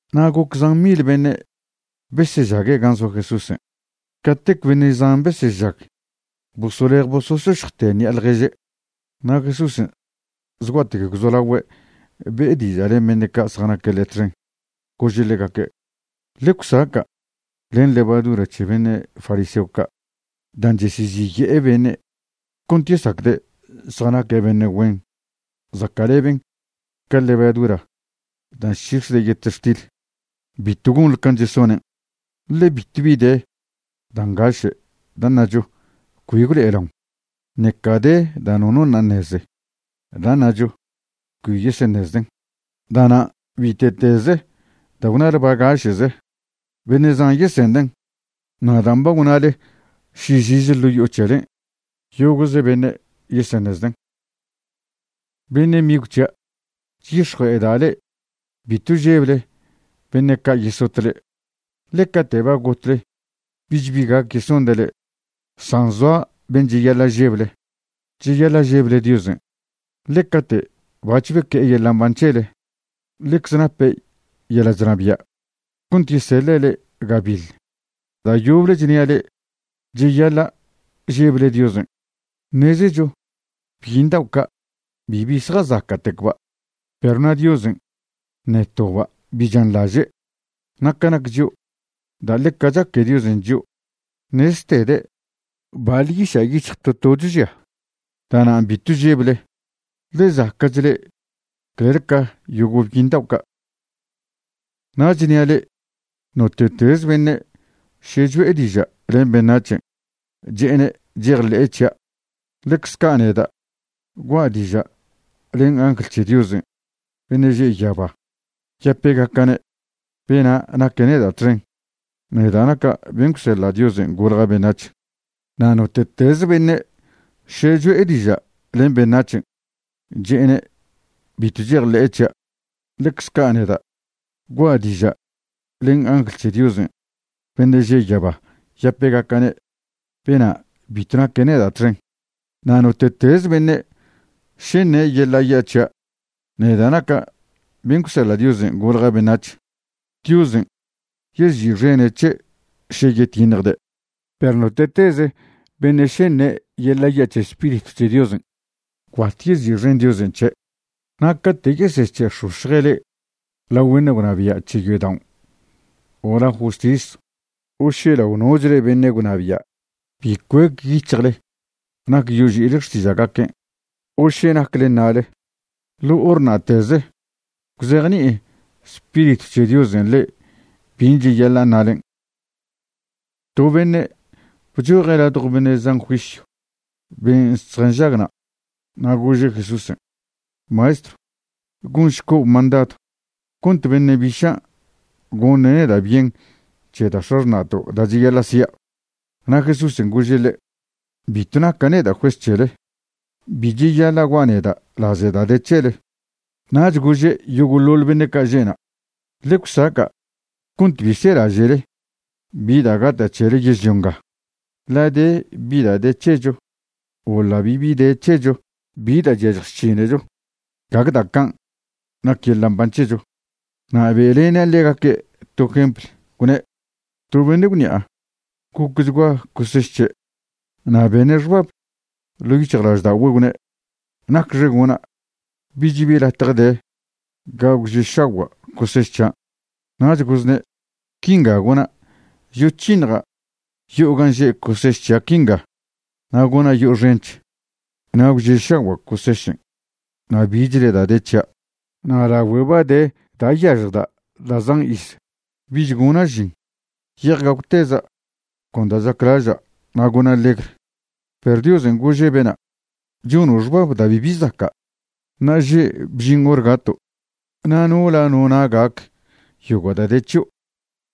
Na' goc zan mil beṉe' besežague' gan' zoa Jesúsen', catec beṉe' zan besežag bosolej bosošošjte ṉi'a ḻježe'. Na' Jesúsen' zgua'tec gwzolagüe' be'e diža' len beṉe' ca' zjanaque' ḻe' txen, gože' ḻegaque': ―Ḻe gwsaca' len levadura c̱he beṉe' fariseo ca'. Dan' cheseziye'e beṉe' cont yesacde' zjanaque' beṉe' güen zaca'leben ca levadura dan' chc̱hix̱ede' yetextil. Bitw gonḻe can' chesonen'. Ḻe bitwbi de da' ngaše' da' ṉacho cbi gwlo'elaon, ṉeca de da' nono ṉa' ṉeze da' ṉacho cbi yeseṉezden'. Da'nan' bite'teze da' gwnale bagaše'ze, beṉe' zan yesenden'. Na' dan' ba gwnale šižize ḻo' yo'o c̱helen', yogo'ze beṉe' yeseṉezden'. ’Beṉe' migw c̱hia', chyix̱jue'eda' le'e bitw žeble beṉe' ca' yesot le'e, ḻe cate' ba gotle bich bi gac yesonde' le'e. San zoa ben' cheyaḻa' žeble, cheyaḻa' žeble Diosen', ḻe cate' bac̱h beque'e yeḻa' mban c̱hele, ḻecze nape' yeḻa' chnabia' cont yeseḻe' le'e gabiḻ. Da' yoble chnia' le'e, cheyaḻa' žeble Diosen'. ’Ṉezecho byiṉ dao' ca' bibi zjazaca'tecba', perw na' Diosen' ṉe toba' bi chanḻaže'. Na' ca nac chio', da' ḻeca chaque Diosen' chio' ṉeztede' baḻ yiša' yic̱hj to tocho žia. Da'nan' bitw žeble, ḻe zaca'ch le'e clel ca yogo' byiṉ dao' ca'. ’Na' chnia' le'e, note'tez beṉe' še cho'e diža' len beṉac̱hen' che'ene' chejḻe'e c̱hia', ḻecze ca' neda' gua'a diža' len angl c̱he Diosen' beṉe' že' yaba yapegaca'ne' bena' naque' neda' txen, neda' naca' ben' gwseḻa' Diosen' golja' beṉac̱h. Na' note'teze beṉe' še cho'e diža' len beṉac̱hen' che'ene' bitw chejḻe'e c̱hia', ḻecze ca' neda' gua'a diža' len angl c̱he Diosen' beṉe' že' yaba yapegaca'ne' bena' bitw naque neda' txen. ’Na' note'teze beṉe' še ṉe' yeḻa' ya' c̱hia' neda' naca' ben' gwseḻa' Diosen' golja' beṉac̱h, Diosen' yezi'xene' c̱he' še yetiṉjde'. Perw note'teze beṉe' še ṉe' yeḻa' ya' c̱he Spiritw c̱he Diosen', gwbat yezi'xen Diosen' c̱he'. ’Na' cate' yesec̱he'ex̱ox̱je' le'e lao beṉe' gwnabia' c̱he yodaon' o lao justis o še lao nochle beṉe' gwnabia', bi cuec yic̱hjle nac yoži'ile xtiža'gaquen' o še nacle ṉale. Ḻo hor na'teze gwzejni'i Spiritw c̱he Diosen' le'e bin' cheyaḻa' ṉalen'. To beṉe' bchoje' ladjo beṉe' zan juisyw ben' zjanžag na', na' gože' Jesúsen': ―Maestrw, gonšco' mandadw cont beṉe' bišan' goṉe' neda' bien c̱he da' x̱axṉa'to' da' cheyaḻa' si'a. Na' Jesúsen' gože' ḻe': ―Bitw naca' neda' juez c̱hele. Bi cheyaḻa' gua' neda' laze da' de c̱hele. Nach gože' yogo'ḻoḻ beṉe' ca' že'na': ―Ḻe gwsaca' cont bi selaže'le bi da' gata' c̱hele yežlio nga, ḻa' de bi de c̱hecho o ḻa' bibi de c̱hecho bi da' chyažj chc̱hinecho, gague da' can' nac yeḻa' mban c̱hecho. Na' be'lene' ḻegaque' to jempl, gwne': ―To beṉe' gwṉi'a gocchgua coseš c̱he', na' bene' xbab ḻo' yic̱hjlažda'ogüe' gwne': “¿Nacxe gona'? Bich bi latje de ga gwže'šagua' coseš c̱hian'.” Nach gozne': “Quinga gona', yoc̱hiṉja' yo'o gan' že' coseš c̱hia' quinga na' gona' yo'o xench. Na' gwže'šagua' cosešen' na' bichle da' de c̱hia'. Na' lagüe ba de da' yažjda' da' zan iz, bich gona' žin. Ye'ej gagwteza' con da' chaclaža' na' gona' legr.” Perw Diosen' gože' bena': “Chono' xbab da' bibi zaca'. Ṉa'aže' bžin hor gato', na' ¿nola ḻo na' gac yogo' da' de c̱hio'?”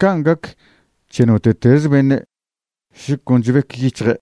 Can' gac c̱he note'tez beṉe' še con chbec yic̱hje'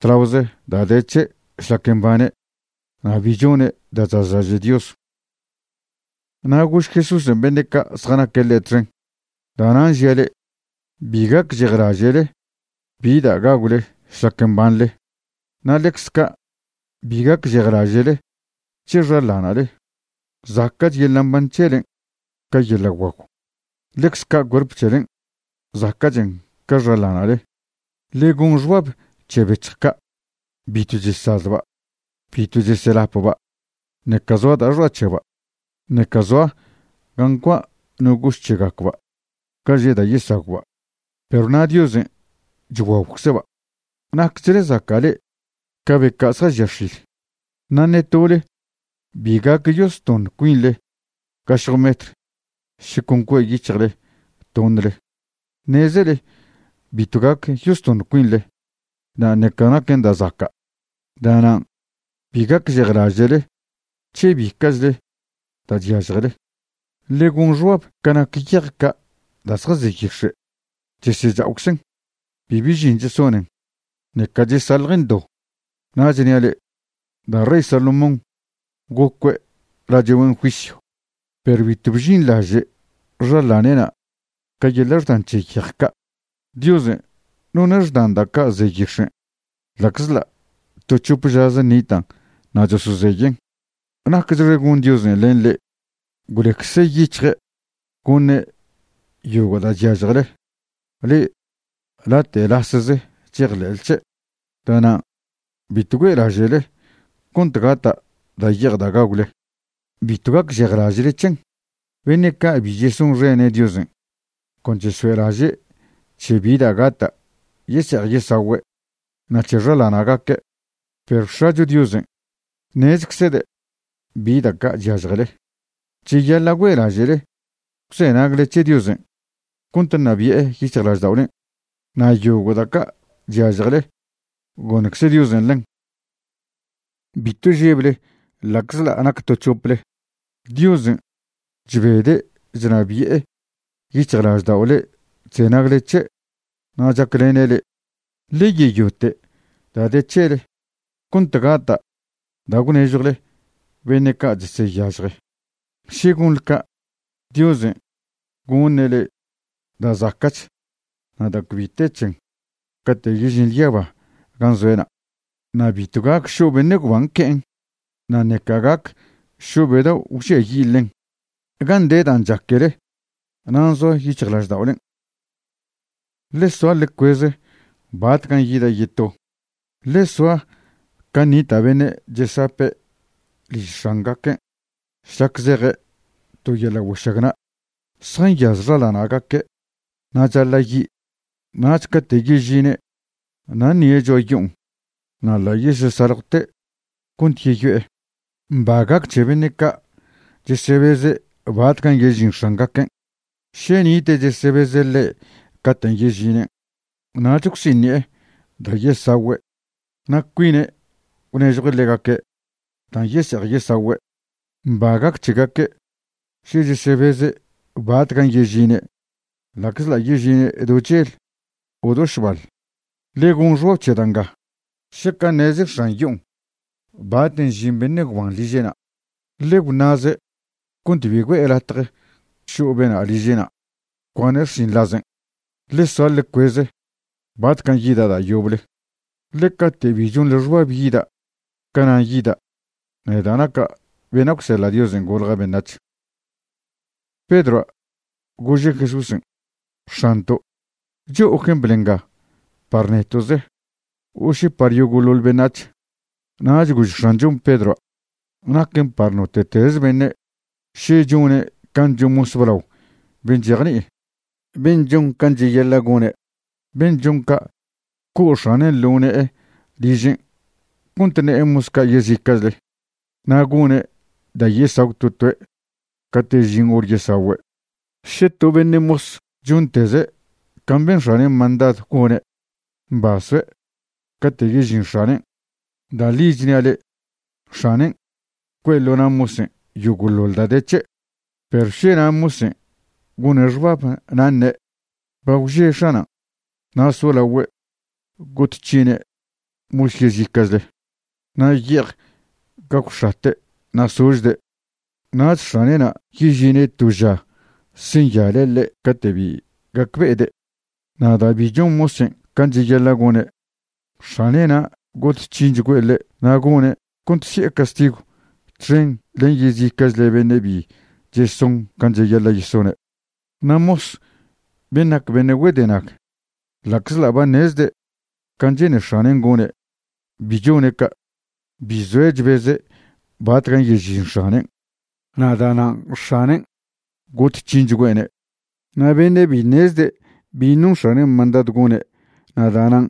tlaoze da' de c̱he' šlac mbane' na' bi chone' da' chazlaže' Dios. Na' gož Jesúsen' beṉe' ca' zjanaque' ḻe' txen: ―Da'nan' žia' le'e, bi gacžejlaže'le bi da' gagwle šlac mbanḻe, na' ḻecz ca' bi gacžejlaže'le c̱he xaḻana'le. Zaca'ch yeḻa' mban c̱helen' ca yeḻa' guagw. Ḻecze ca' cuerp c̱helen', zaca'chen ca xaḻana'le. Ḻe gon xbab c̱he bec̱hj ca', bitw chesazba', bitw chesyelapba', ṉeca zoa da'a xoa' c̱hegacba', ṉeca zoa ga ncua' no goš c̱hegacba' ga že' da' yesagwba', perw na' Diosen' chguagwcze'ba'. ¡Nacchle zaca' le'e ca be ca' zjažia x̱il! Na' ṉe tole bi gac yostoṉ cuinḻe gašje metr še con cue' yic̱hjle toṉle. Ṉezele bitw gac yostoṉ cuinḻe, na' ṉeca naquen da' zaca'. Da'nan' bi gacžejlaže'le c̱he bica'chle da' chyažjele. ’Ḻe gon xbab ca nac yej ca' da' zjaze yix̱e'. Chesecha'oczen, bibi žin chesonen, ṉeca chesaḻjen do. Na' chnia' le'e, da' rey Salomón gocue' lache' güen juisyw, perw bitw bžinḻaže' xaḻane'na' ca yeḻa' xdan c̱he yej ca'. Diosen' none' xdan da' ca' ze yix̱en' ḻa'czḻa' to c̱hop žaze nitan' na' chosozeyen'. ¡Nacchxe gon Diosen' len le'e gwleccze yic̱hje' goṉe' yogo' da' chyažjele, le'e late' lasze chejḻe'le c̱he'! Da'nan' bitw güe'laže'le cont gata' da' ye'ej da' gagwle. Bitw gacžejlaže'le c̱hen. Beṉe' ca' bi chesonxene' Diosen' con chesoe'laže' c̱he bi da' gata' yese'ej yesagüe' na' c̱he xaḻana'gaque'. Perw X̱acho Diosen' ṉezczede' bi da' ca' chyažjele. Cheyaḻa' güe'laže'le gwzenagle c̱he Diosen' cont ṉabi'e yic̱hjlažda'olen', na' yogo' da' ca' chyažjele, goṉcze Diosen' ḻen. ’Bitw žeble ḻa'czḻa' nac to c̱hople. Diosen' chbede' chnabi'e yic̱hjlaždao' le'e chzenagle c̱he' na' chaclene' le'e. Ḻe yeyote' da' de c̱hele cont gata' da' gwnežjwle beṉe' ca' cheseyažje. Še gonḻe ca', Diosen' goṉe' le'e da' zaca'ch na' da' cbi te c̱hen cate' yežinḻe yaba gan' zoe'na'. Na' bitw gac šo' beṉe' gwban que'en, na' ṉeca gac šo' be dao' gwžiayi' ḻen. Gan' de dan' chaquele nan' zoa yic̱hjlažda'olen'. ’Ḻe soa ḻe cueze batcan' yida' yeto. Ḻe soa can' nita' beṉe' chesape' liž x̱angaquen' šlac zeje' to yeḻa' güešagna'. Zjanyaz xaḻana'gaque' na' chaḻa' yi'. Nach cate' yežine' na' ṉie' cho'a yo'on, na' ḻa' yesesaljwte' cont yeyo'e. Mba gac c̱he beṉe' ca' chesebeze' batcan' yežin x̱angaquen'. Še nite' chesebeze' ḻe' caten' yežinen', nach gwsiṉi'e da' yesagüe' na' cuine' gwnežjue' ḻegaque' dan' yese'ej yesagüe'. Mba gac c̱hegaque' še chesebeze' batcan' yežine' ḻa'czḻa' yežine' do chel o do šbal. Ḻe gon xbab c̱he da' nga. Šaca' ṉeze x̱an yo'on baten' žin beṉe' gwban liže'na', ḻe gwṉa'ze' cont bi güe'e latje šo' bena' liže'na' cuane' xšinḻazen'. Ḻe soa ḻe cueze batcan' yida' da' yoble, ḻe cate' bi chonḻe xbab yida', canan' yida', neda' naca' bena' gwseḻa' Diosen' golja' beṉac̱h. Pedroa' gože' Jesúsen': ―X̱anto', ¿cho'o jempl nga par neto'ze o še par yogo'ḻoḻ beṉac̱h? Nach gož X̱anchon' Pedroa': ―Naquen par note'tez beṉe' še chone' can' chon mos blao ben' chejni'i, ben' chon can' cheyaḻa' gone'. Ben' chon ca', co' x̱ane' ḻo ne'e ližen' cont ṉe'e mos ca' yezica'chle. Na' gone' da' yesagw to toe' cate' žin hor yesagüe'. Še to beṉe' mos chonteze' can' ben x̱anen' mandadw gone', mba soe' cate' yežin x̱anen'. Da' ḻi chnia' le'e, x̱anen' cue'e ḻo na' mosen' yogo'ḻoḻ da' de c̱he'. Perw na' še mosen' gone' xbab na' ṉe': “Ba gwže x̱anan'”, na' solagüe' got c̱hine' mosa' yezica'chle na' ye'ej gagwx̱ate' na' sožde', nach x̱ane'na' yežine' to ža senyaḻe' ḻe' cate' bi gacbe'ede'. Na' da' bi chon mosen' can' cheyaḻa' gone', x̱ane'na' got c̱hinchgüe' ḻe' na' gone' cont si'e castigw txen len yezica'chle beṉe' bi cheson can' cheyaḻa' yesone'. ’Na' mos ben' nac beṉe' güedenag, ḻa'czḻa' ba ṉezde' can' che'ne x̱anen' gone', bi chone' ca'. Bi zoe' chbeze' batcan' yežin x̱anen', na' da'nan' x̱anen' got c̱hinchgüe'ne'. Na' beṉe' bi ṉezde' bin' non x̱anen' mandadw gone' na' da'nan'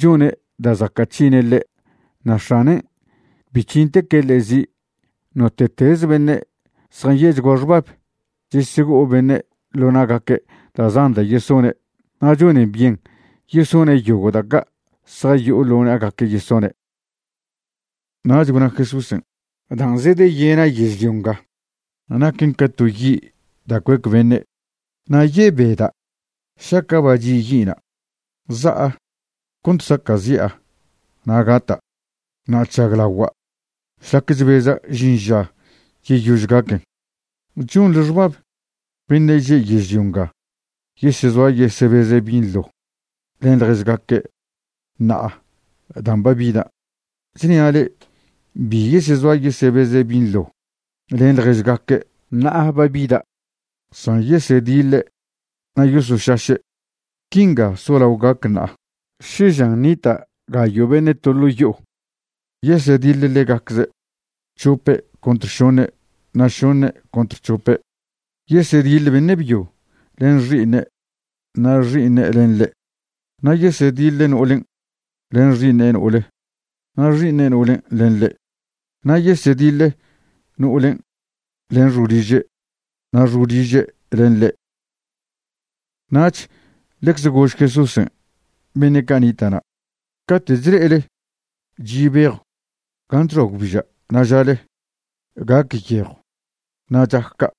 chone' da' zaca' c̱hine' ḻe', na' x̱anen' bi c̱hinteque' ḻe' zi'. Note'teze beṉe' zjanye'chgua xbab, chesego'o beṉe' ḻo na'gaque' da' zan da' yesone', na' chonen byen yesone' yogo' da' ca' zjayo'o ḻo na'gaque' yesone'. Nach gwna Jesúsen': ―Dan' zedeyena' yežlio nga naquen ca to yi' da' cuec beṉe'. Na' yebeda' šaca' ba chi' yi'na'. Za'a cont saca'zi'a na' gata'. Na' chžaglagua' šlac chbeza' žin ža yeyož gaquen. ¿Chonḻe xbab beṉe' že' yežlio yesezoa yesebeze' binḻo len ḻježgaque' ṉa'a dan' ba bidan'? Chnia' le'e, bi yesezoa yesebeze' binḻo len ḻježgaque' ṉa'a ba bida', san yesediḻe' na' yosošaše'. Quinga solao gac ṉa'a, še žan nita' gayo' beṉe' to ḻo' yo'o, yesediḻ ḻegacze', c̱hope' contr šoṉe' na' šoṉe' contr c̱hope'. Yesediḻ beṉe' byo len xi'iṉe' na' xi'iṉe' len ḻe'. Na' yesediḻ no'olen' len xi'iṉe' no'ole, na' xi'iṉe' no'olen' len ḻe'. Na' yesediḻ no'olen' len xo'oliže' na' xo'oliže' len ḻe'. Nach ḻecze gož Jesúsen' beṉe' ca' nita' na': ―Cate' chle'ele chi' bejw gan' chxoa gwbiža' na' žale: “Gac yejw”, na' chac ca'.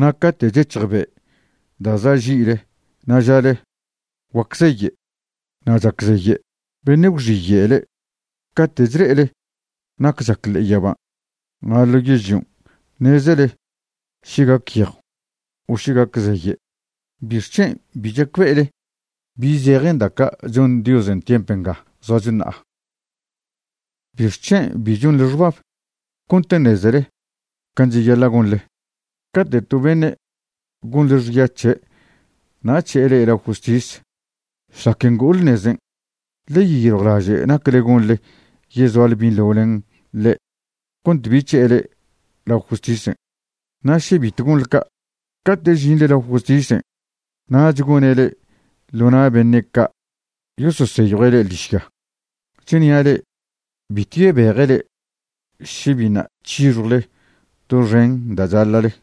Na' cate' chec̱hj be' da' za' ži'le na' žale: “Guac zeye'”, na' chac zeye'. Beṉe' gwxiye' le'e. Cate' chle'ele nac chac ḻe'e yaban' na' ḻo yežlion' ṉezele še gac yejw o še gac zeye'. ¿Bixc̱hen' bi chacbe'ele bi zejen da' ca' chon Diosen' tiemp nga zoacho ṉa'a? ’¿Bixc̱hen' bi chonḻe xbab cont ṉezele can' cheyaḻa' gonḻe? Cate' to beṉe' gonḻe xya c̱he' na' c̱he'e le'e lao justis, šlac ngo'ole nezen' ḻe yeyiljwlaže' nac gonḻe yezoale binḻo len ḻe' cont bi c̱he'e le'e lao justisen'. Še bitw gonḻe ca', cate' žinḻe lao justisen' nach gone' le'e ḻo na' beṉe' ca' yososeyjue' le'e ḻižya. Chnia' le'e bitw yebeje' le'e še biṉa' c̱hixjwle doxen da' chaḻa'le.